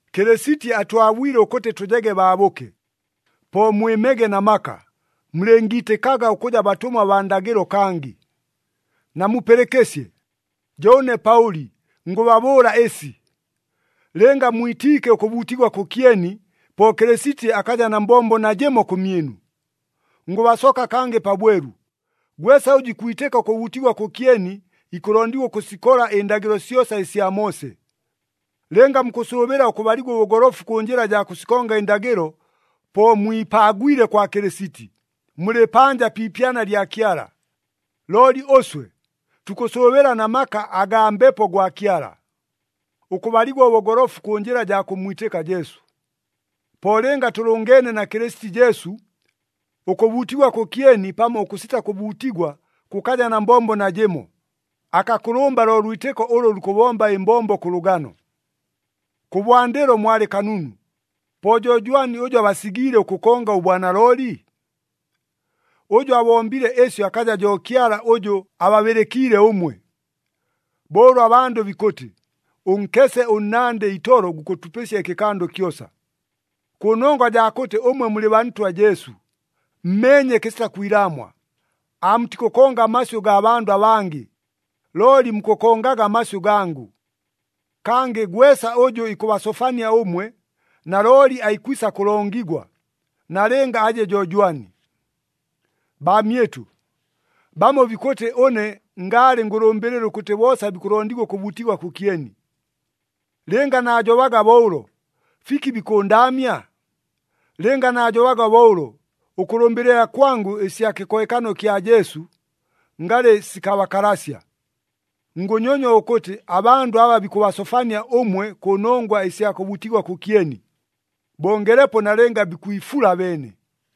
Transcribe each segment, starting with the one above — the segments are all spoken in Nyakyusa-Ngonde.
Kɨlɨsiti atwabwile ʉkʉtɨ tʉjege baabʉke. Po mwɨmege na maka, mulɨngiitɨkaga ʉkʉja batʉmwa baa ndagɨlo kangɨ. Namupɨlɨkɨsye! Jo ʉne Paʉli ngʉbabʉʉla ɨsi! Lɨnga mwitiike ʉkʉbuutigwa kʉkyeni, po Kɨlɨsiti akaja na mbombo najɨmo kʉmyɨnu. Ngʉbasoka kangɨ pabwelu, gwesa ʉjʉ ikwitɨka ʉkʉbuutigwa kʉkyeni, ikʉlondigwa ʉkʉsikola ɨndagɨlo syosa ɨsya Moose. Lɨnga mukʉsʉʉbɨla ʉkʉbaligwa ʉbʉgolofu kʉ njɨla jaa kʉsikonga ɨndagɨlo, po mwipaagwile kwa Kɨlɨsiti, mulɨ panja pi ipyana lya Kyala. Looli ʉswe, tukʉsʉʉbɨla na maka agaa Mbepo gwa Kyala, ʉkʉbaligwa ʉbʉgolofu kʉ njɨla jaa kʉmmwitɨka Jesu. Po lɨnga tʉlʉngeene na Kɨlɨsiti Jesu, ʉkʉbuutigwa kʉkyeni pamo ʉkʉsita kʉbuutigwa kʉkaja na mbombo najɨmo, akakʉlʉmba lo lwitɨko ʉlʉ lukʉbomba ɨmbombo kʉ lʉgano. Kʉbwandɨlo mwalɨ kanunu! Po jo jwani ʉjʉ abasigiile ʉkʉkonga ʉbwanalooli? Ʉjʉ abombile ɨsyo akaja jo Kyala ʉjʉ ababɨlɨkiile ʉmwe. Bo ʉlʉ abandʉ bikʉtɨ, “Ʉnkese ʉnnandɨ itolo gukʉtupɨsya ɨkɨkando kyosa!” Kʉnongwa jaa kʉtɨ ʉmwe mulɨ baa Ntwa Jesu, mmeenye kɨsita kwilaamwa, aamutikʉkonga amasyʉ gaa bandʉ abangɨ, looli mukʉkongaga amasyʉ gangʉ. Kangɨ gwesa ʉjʉ ikʉbasofania ʉmwe, nalooli aikwisa kʉlongigwa, nalɨnga aje jo jwani. Baamyɨtʉ, bamo bikʉtɨ ʉne ngaalɨ ngʉlʉmbɨlɨla ʉkʉtɨ boosa bikʉlondigwa ʉkʉbuutigwa kʉkyeni. Lɨnga naajobaga bo ʉlo, fiki bikʉndaamya? Lɨnga naajobaga bo ʉlo, ʉkʉlʉmbɨlɨla kwangʉ ɨsya kɨkohekano kya Jesu, ngalɨ sikabakalasya. Ngʉnyonywa ʉkʉtɨ abandʉ aba bikʉbasofania ʉmwe kʉnongwa ɨsya kʉbuutigwa kʉkyeni, bongelepo nalɨnga bikwifula abeene!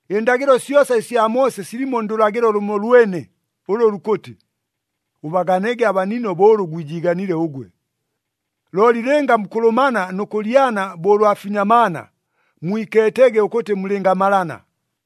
Ɨndagɨlo syosa ɨsya Moose silimo ndʉlagɨlo lʉmolwene ʉlʉ lukʉtɨ, “Ʉbaganege abanino bo ʉlʉ gwijiiganile ʉgwe.” Looli lɨnga mukʉlʉmana nʉ kʉlyana bo ʉlwa finyamaana, mwikeetege ʉkʉtɨ mulɨngamalana.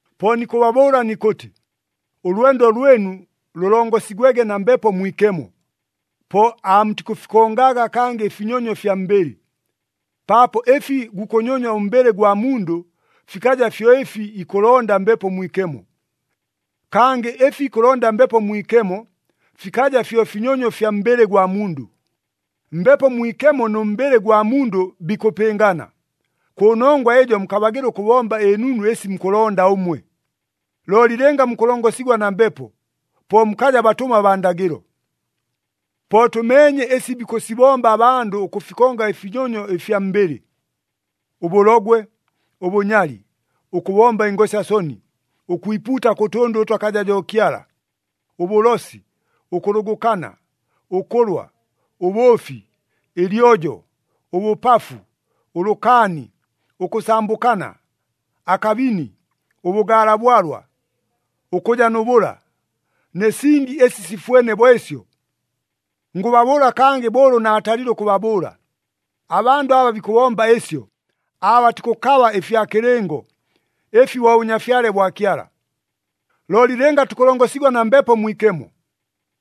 Po nikʉbabʉʉla nikʉtɨ, ʉlwendo lwɨnu lʉlongosigwege na Mbepo Mwikemo, po aamutikʉfikongaga kangɨ ɨfinyonyo fya mbɨlɨ. Paapo ɨfi gukʉnyonywa ʉmbɨlɨ gwa mundʉ, fikaja fyo ɨfi ikʉlonda Mbepo Mwikemo. Kangɨ ɨfi ikʉlonda Mbepo Mwikemo, fikaja fyo finyonyo fya mbɨlɨ gwa mundʉ. Mbepo Mwikemo nʉ mbɨlɨ gwa mundʉ bikʉpɨngana, kʉnongwa ɨjo mukabagɨla ʉkʉbomba ɨnunu ɨsi mukʉlonda ʉmwe. Looli lɨnga mukʉlongosigwa na Mbepo, po mukaja batʉmwa baa ndagɨlo. Po tʉmeenye ɨsi bikʉsibomba abandʉ ʉkʉfikonga ɨfinyonyo ɨfya mbɨlɨ: Ʉbʉlogwe, ʉbʉnyali, ʉkʉbomba ɨngosya soni, ʉkwipuuta kʉ tʉndʉ ʉtʉ akaja jo Kyala, ʉbʉlosi, ʉkʉlʉgʉkana, ʉkʉlwa, ʉbʉʉfi, ɨlyojo, ʉbʉpafu, ʉlʉkaani, ʉkʉsambʉkana, akabini, ʉbʉgaala bwalwa, ʉkʉja nʉ bʉla, nɨ singi ɨsi sifwene bo ɨsyo. Ngʉbabʉʉla kangɨ bo ʉlʉ naatalile ʉkʉbabʉʉla, abandʉ aba bikʉbomba ɨsyo, aabatikʉkaba ɨfya kɨlɨngo, ɨfi bo Bʉnyafyale bwa Kyala. Looli lɨnga tukʉlongosigwa na Mbepo Mwikemo,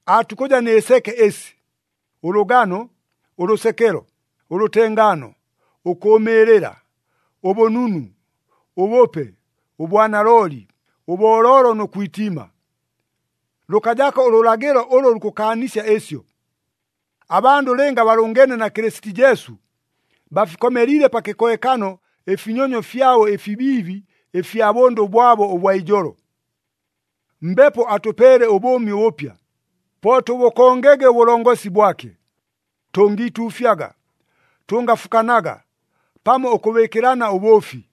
aatukʉja nɨ seke ɨsi: Ʉlʉgano, ʉlʉsekelo, ʉlʉtengaano, ʉkʉʉmɨɨlɨla, ʉbʉnunu, ʉbʉpe, ʉbwanalooli, ʉbooloolo nʉ kwitiima. Lʉkajako ʉlʉlagɨlo ʉlʉ lukʉkaanisya ɨsyo. Abandʉ lɨnga balʉngeene na Kɨlɨsiti Jesu, bafikomeliile pa kɨkohekano ɨfinyonyo fyabo ɨfibiibi ɨfya bʉndʉ bwabo ʉbwa ijolo. Mbepo atʉpeele ʉbʉʉmi ʉbʉpya, po tʉbʉkongege ʉbʉlongosi bwake. Tʉngiituufyaga, tʉngafukanaga, pamo ʉkʉbɨɨkɨlana ʉbʉʉfi.